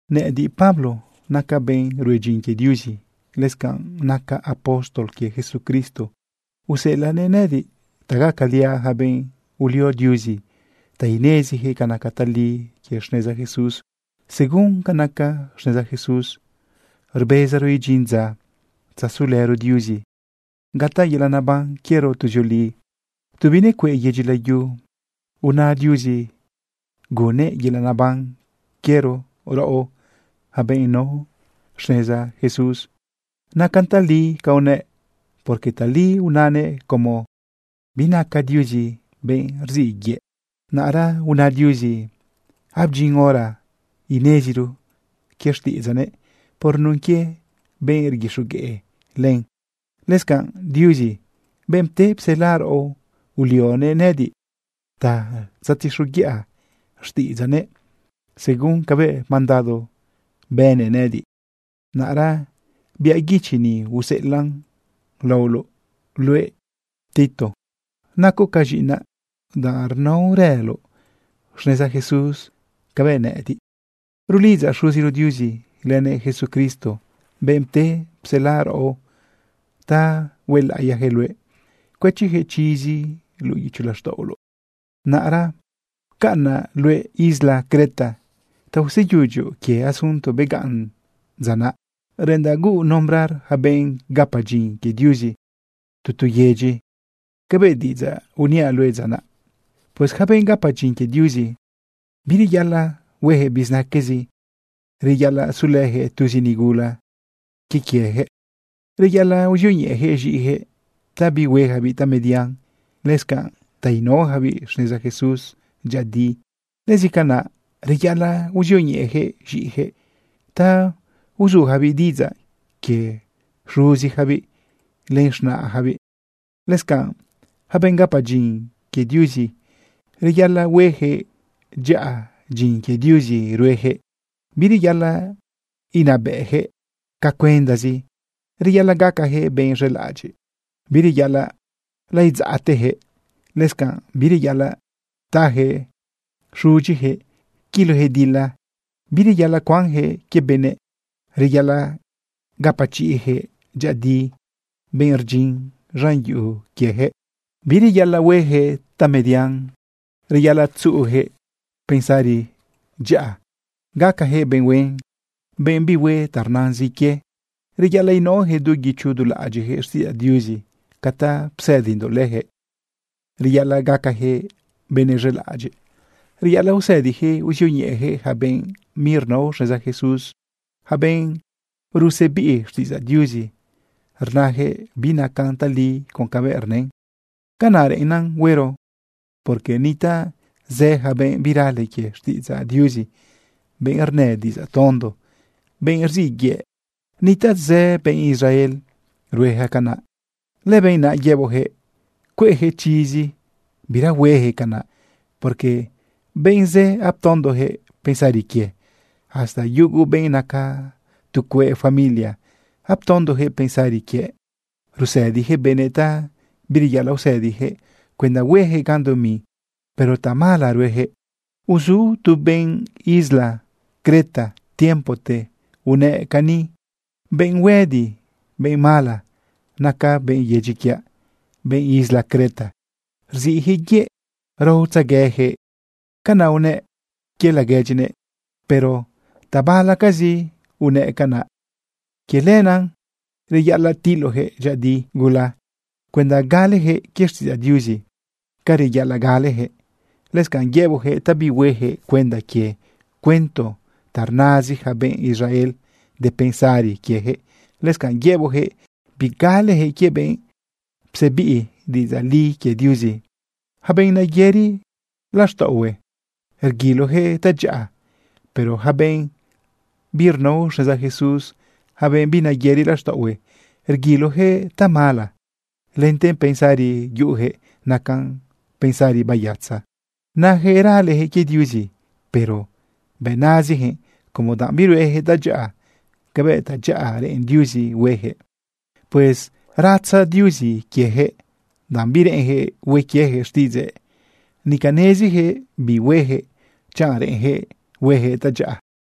Nëꞌëdiꞌ, Pablo, nacaꞌ benꞌ rue dyin quie Diuzi. Lëscanꞌ nacaꞌ apóstol quie Jesucristo, useꞌelaꞌnëꞌ nëꞌëdiꞌ ta gacaliaꞌ yaca benꞌ ulio Diuzi ta ineziyaquëꞌ ca naca tali quie xneza Jesús. Según ca naca xneza Jesús rbezaro idyin dza tzazulëro Diuzi gataꞌ yelaꞌ neban quiero tuzioli. Tu binecueꞌ yedyi layu una Diuzi gunnëꞌ yelaꞌ neban quiero raꞌo, yaca benꞌ nao xneza Jesús. Nacan tali ca unëꞌ, porque tali unanëꞌ como binaca Diuzi benꞌ rziꞌ yëꞌ. Naꞌra una Diuzi abdyin hora ineziro quie xtiꞌidzaꞌnëꞌ por nun quie benꞌ rguixogueꞌ len. Lëscanꞌ Diuzi, benꞌ pte psela raꞌo, ulionëꞌ nëꞌëdiꞌ ta tzetixoguiꞌa xtiꞌidzaꞌnëꞌ según cabëꞌ mandado bënnëꞌ nëꞌëdiꞌ. Naꞌra biaꞌ guichi ni useꞌelaꞌn laoloꞌ luëꞌ, Tito. Nacoꞌ ca z̃iꞌinaꞌ, danꞌ rnaorëloꞌ xneza Jesús cabëꞌ nëꞌëdiꞌ. Rulidzaꞌ Xuziro Diuzi lënëꞌ Jesucristo, benꞌ pte psela raꞌo, ta huelaꞌiyaquëꞌ luëꞌ cuëchiyaquëꞌ chizi luꞌu guicho laxtaꞌoloꞌ. Naꞌra pcaꞌnaꞌ luëꞌ isla Creta ta useyudyoꞌ quie asunto begaꞌn dza naꞌ. Reꞌendaꞌ huuꞌ nombrar yaca benꞌ gapa dyin quie Diuzi tu tu yedyi cabëꞌ diꞌidzaꞌ uniaꞌ luëꞌ dza naꞌ. Pues yaca benꞌ gapa dyin quie Diuzi, bireyaꞌalaꞌ hueyaquëꞌ bizinaquezi. Reyaꞌalaꞌ sulëjëꞌ tuzi nigula quie quieyaquëꞌ. Reyaꞌalaꞌ uzioñeꞌejëꞌ z̃iꞌiyaquëꞌ ta bihueyacabiꞌ tamedian, lëscanꞌ ta inaoyacabiꞌ xneza Jesús dyëꞌëdi. Lëscanaꞌ reyaꞌalaꞌ uzioñeꞌejëꞌ z̃iꞌijëꞌ ta uzujabiꞌ diꞌidzaꞌ quie xuziyacabiꞌ len z̃naꞌyacabiꞌ. Lëscanꞌ yaca benꞌ gapa dyin quie Diuzi, reyaꞌalaꞌ huejëꞌ dyaꞌa dyin quie Diuzi rueyaquëꞌ. Bireyaꞌalaꞌ inabëꞌjëꞌ ca cuendazi. Reyaꞌalaꞌ gacajëꞌ benꞌ z̃elaꞌadyiꞌ. Bireyaꞌalaꞌ laidzaꞌteyaquëꞌ. Lëscanꞌ bireyaꞌalaꞌ tajëꞌ xudyiyaquëꞌ quilojëꞌ dila. Bireyaꞌalaꞌ cuanjëꞌ quie benëꞌ. Reyaꞌalaꞌ gapachiꞌjëꞌ dyëꞌëdi benꞌ rdyin z̃an yuꞌu quieyaquëꞌ. Bireyaꞌalaꞌ hueyaquëꞌ tamedian. Reyaꞌalaꞌ tzuꞌuyaquëꞌ pensari dyaꞌa, gacajëꞌ benꞌ huen, benꞌ bihue ta rnazin quie. Reyaꞌalaꞌ inaoyaquëꞌ du guicho du laꞌadyiꞌjëꞌ xtiꞌidzaꞌ Diuzi ca ta psëdindoꞌ leyaquëꞌ. Reyaꞌalaꞌ gacajëꞌ benëꞌ z̃elaꞌadyiꞌ. Reyaꞌalaꞌ usëdiyaquëꞌ uzioñeꞌeyaquëꞌ yaca benꞌ birnao xneza Jesús, yaca benꞌ rusebiꞌ xtiꞌidzaꞌ Diuzi rnayaquëꞌ binacan tali con cabëꞌ rnën. Canaꞌ reꞌennan huero, porque nitaꞌ zë yaca benꞌ birale quie xtiꞌidzaꞌ Diuzi, benꞌ rnë diꞌidzaꞌ tondo, benꞌ rziꞌ yëꞌ. Nitaꞌ zë benꞌ Israel rueja canaꞌ. Lëbenꞌ naꞌ yeboꞌjëꞌ cueꞌjëꞌ chizi bira huejëꞌ canaꞌ, porque benꞌ zë aptondojëꞌ pensari quie, hasta yugu benꞌ naca tu cueꞌ familia aptondojëꞌ pensari quie. Rusëdiyaquëꞌ benëꞌ ta bireyaꞌalaꞌ usëdiyaquëꞌ cuenda huejëꞌ gan dumi, pero tamala ruejëꞌ. Uzu tu benꞌ isla Creta tiempote unëꞌ cani: “Benꞌ huëdi, benꞌ mala, naca benꞌ yedyi quiaꞌ, benꞌ isla Creta. Rziꞌyaquëꞌ yëꞌ, raotzegueyaquëꞌ.” Canaꞌ unëꞌ quie laguedyinëꞌ, pero tabalacazi unëꞌ canaꞌ. Quie lenaꞌ reyaꞌalaꞌ tiloꞌyaquëꞌ dyëꞌëdi gula cuenda galejëꞌ quie xtiꞌidzaꞌ Diuzi ca reyaꞌalaꞌ galejëꞌ. Lëscanꞌ yëboꞌjëꞌ ta bihuejëꞌ cuenda quie cuento ta rnazi yaca benꞌ Israel de pensarizi quieyaquëꞌ. Lëscanꞌ yëboꞌjëꞌ bigalejëꞌ quie benꞌ psebiꞌn diꞌidzaꞌ li quie Diuzi. Yaca benꞌ nayëri laxtaꞌohue, rguiloyaquëꞌ tadyaꞌa, pero yaca benꞌ birnao xneza Jesús, yaca benꞌ binayëri laxtaꞌohue, rguiloyaquëꞌ tamala. Lente pensari yuꞌuyaquëꞌ nacan pensari bayatza. Nayaquëꞌ raleyaquëꞌ quie Diuzi, pero bëꞌ nazijëꞌ como danꞌ birueyaquëꞌ tadyaꞌa cabëꞌ tadyaꞌa reꞌen Diuzi hueyaquëꞌ. Pues ratza Diuzi quieyaquëꞌ, danꞌ bireꞌenyaquëꞌ hue quieyaquëꞌ xtiꞌidzëꞌ. Nica nezijëꞌ bi huejëꞌ chanꞌ reꞌenjëꞌ huejëꞌ tadyaꞌa.